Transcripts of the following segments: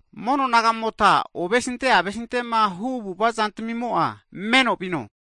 Mono nagamota ovesinte avesitema hu avu'ava'zantamimo'a meno vino.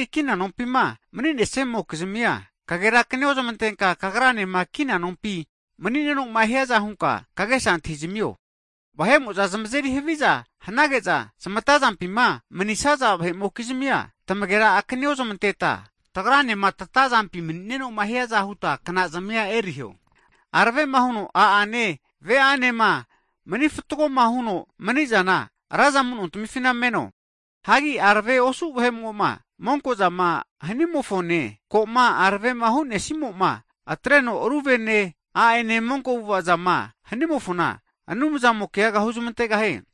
Hagi kina nompima mani'nesamokizmia kagerakani ozmantenka, kagranema kina nompima mani'nenoma hiaza hunka, kagesa antahizamio. Vahe'mo'za zmazeri haviza hanage'za zmatazampima mni'nesaza vahe'mokizmia, tamagera akani ozmanteta, tagranema tata zampima mni'nenoma hiaza huta knazmia eriho. Aravema huno a'ane ve'anema manifatgoma huno mni'zana, raza amunontamifina meno, hagi aravema osu' vahe'mo'ma monkozama hanimofone, koma aravema hu'nesimoma atreno, ru vene a'ene monko avu'ava'zama hanimofona, Anumzamo keaga huzmantegahie.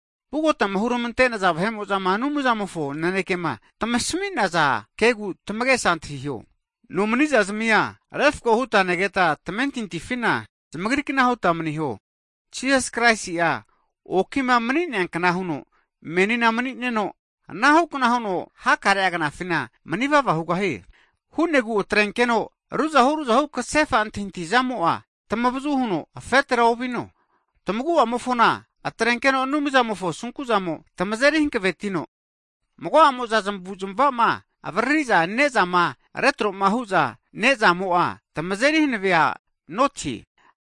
Vugotama huramantenaza vahe'mozama Anumzamofo nanekema tamasminaza kegu tamagesa antahiho. Nomani zazmia refako huta negeta tamentintifina, zamagrikna huta maniho. Jisas Kraisi'a okima mani'neakna huno menina mani'neno, anahukna huno hakare'a knafina manivava hugahie. Hu'negu atrenkeno ruzahu ruzahu kasefa antahintahizamo'a tamavazu huno afetera ovino. Tamaguamofona atrenkeno Anumzamofo asunkuzamo tamazeri hakavetino, mago'amo'za zmavu'zmava'zama avaririza ne'zama retro'ma hu'za nezamo'a, tamazeri hanavea notie.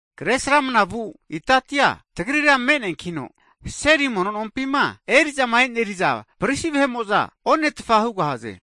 Kre sramanavu itatia, tagrira me'neankino, seri mono nompima eri'zama eneri'za prisi vahe'mo'za onetfa hugahaze.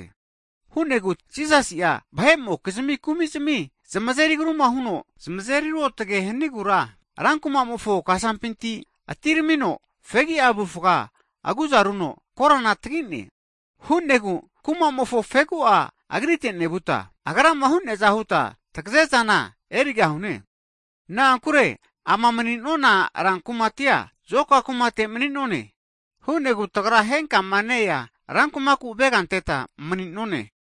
Ana hu'negu Jisasi'a vahe'amokizmi kumizmi zmazeri agruma huno zamazeri ruotge hanigura, rankumamofo kasampinti atiramino fegia avufga aguzaruno korana tagine. Hu'negu kuma'mofo fegu'a Agrite nevuta, Agrama hu'neaza huta tagazezana erigahune. Na'ankure ama mni'nonana rankumatia zoka kumate mani'none, hu'negu tagra henkama ne-ea rankumaku avega anteta mani'none.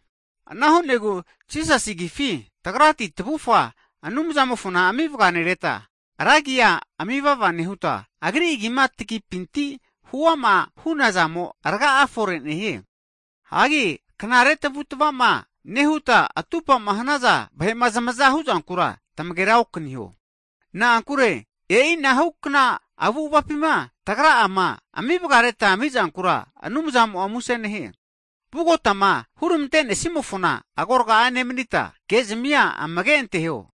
Ana hu'negu Jisas Agifi, tagrati tavufga Anumzamofona ami vganereta, ra agia ami'vava nehuta, Agri Agima tagipinti huama hunazamo rga'a fore nehie. Hagi knare tamavu'tamavama nehuta, atupama hanaza vahe'ma zamaza huzankura tamagera okaniho. Na'ankure e'inahukna avu'avapima tagra'ama amivgareta amizankura, Anumzamo'a muse nehie. Vugotama hurmantenesimofona agorga nemanita, ke'zamia amage anteho.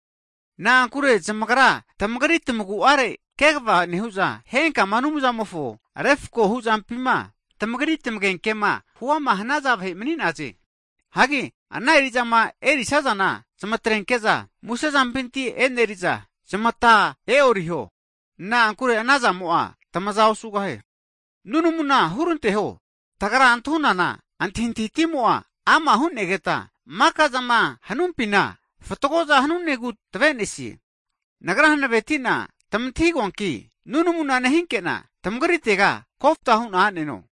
Na'ankure zamagra tamagri tamagu'are kegva nehu'za, henkama Anumzamofo refako huzampina tamagri tamagenkema hu'ama hanaza vahe mani'naze. Hagi ana eri'zama erisazana zamatrenke'za musezampinti e'neri'za zamata e'oriho, na'ankure ana zamo'a tamaza osugahie. Nunamuna huranteho, tagra antahunana antahintahitimo'a ama' hu'negeta mikazama hanumpina fatgoza hanunegu tavenesie. Nagra hanavetina tamantahigoanki, nunamu nehinkena tamagritega koftahu'na aneno.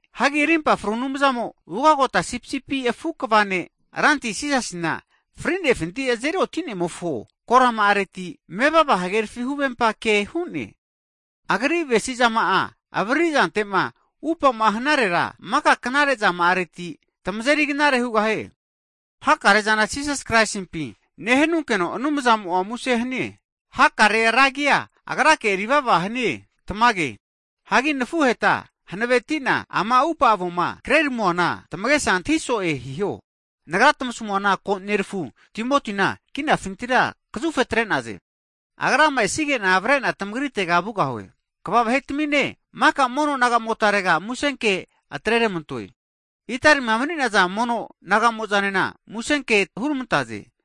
Hagi arimpa fru Anumzamo, ugagota sipisipi afu kva ne' Ranti Jisasina fri'nefinti azeri oti'nemofo korama'areti, mevava hagerafi huvempa ke hu'ne. Agri avesizama'a avaririzantema upama hanarera, maka knare zama'areti tamazeri knare hugahie. Hakare'zana Jisas Kraisimpi nehanunkeno Anumzamo'a muse hanie. Hakarea ra agia Agrake erivava hanie. Tamage. Hagi nafuheta hanavetina ama upa avoma kreramuana tamagesa antahi'so'e hiho. Nagra tamasamuana, ko nerafu Timotina kinafinitira kazufetre'naze. Agrama esige'na, avare'na tamagritega vugahu'e. Kava vahetamine, maka mono naga'motarega musenke atreramantoe. Italima mani'naza mono nagamo'zanena musenkea hurmantaze.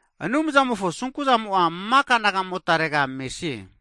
Anumzamofo asunku zamo'a maka nagamotare mesie.